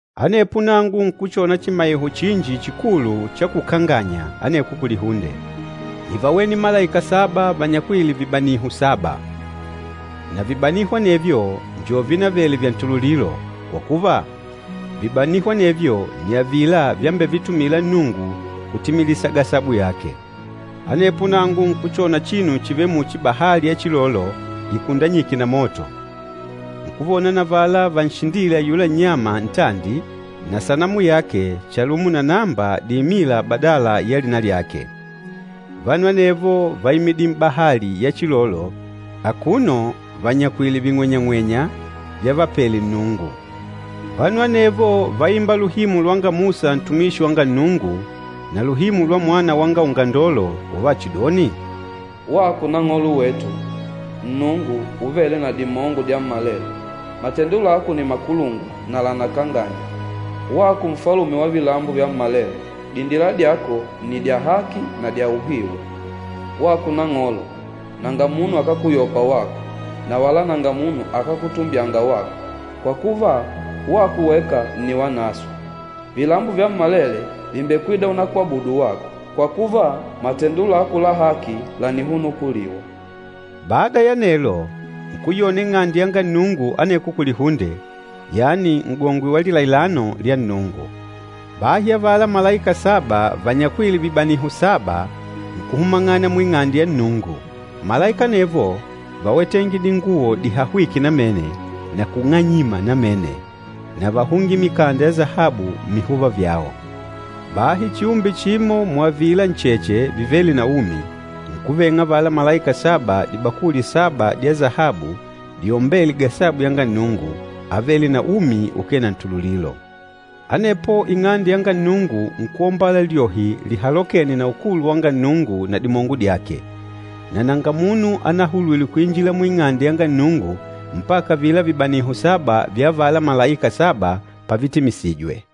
Anepo nangu nkuchona chimaiho chinji chikulu cha kukanganya aneko kulihunde. Nívawene malaika saba vanyakwîle vibaniho saba. Na vibaniho anevyo njo vínavele vya ntululilo, kwa kuva, vibaniho anevyo nni avila vyambevitumila Nnungu kutimilisa gasabu yake. Anepo nangu nkuchona chinu chivêle muchi bahali ya chilolo ikundanyîke na moto. Nkuvona na avala vanshindîle ayula nnyama ntandi na sanamu yake chalumo na namba diimîla badala ya lina lyake. Vanu anevo váimidile m'bahali ya chilolo akuno vanyakwìlè ving'wenyang'wenya vyavapele Nnungu. Vanu anevo váimba luhimu lwanga Musa ntumishi wanga Nnungu, na luhimu lwa Mwana wanga Ungandolo, uvachidoni, “Wako Nang'olo wetu, Nnungu Uvêle na Dimongo Dyammalele, matendo lako ni makulungwa na lànakanganya! Wako Nfalume wa vilambo vyammalele, dindila dyako nni dya haki na dya uhiu! Wako Nang'olo, nanga munu akákuyopa wako, na wala nanga munu akákutumbyanga wako! Kwa kuva, wako weka nni Wanaswe. Vilambo vyammalele vìmbekwida unakwabudu wako, kwa kuva, matendo lako la haki lànihunukuliwa!” Bada ya anelo, nkuyona Ing'ande yanga Nnungu aneko kulihunde, yani N'gongwe wa Lilailano lya Nnungu. Bahi avala malaika saba vanyakwîle vibaniho saba nkuhumang'ana mu Ing'ande yanga Nnungu. Malaika anevo váwetenge dinguwo dihahwîke namene na kung'anyima namene, na váhungile mikanda ya sahabu mmihuva vyao. Bahi chiumbe chimo muavila ncheche vivêle na umi, nkuveng'a avala malaika saba dibakuli saba dya sahabu diombêle gasabu yanga Nnungu, avêle na umi ukee na ntululilo. Anepo Ing'ande yanga Nnungu nkuombala lyohi lihalokêne na ukulu wanga Nnungu na dimongo dyake. Na nanga munu anahulwile kuinjila mu Ing'ande yanga Nnungu mpaka avila vibaniho saba vya avala malaika saba pavitimisijwe.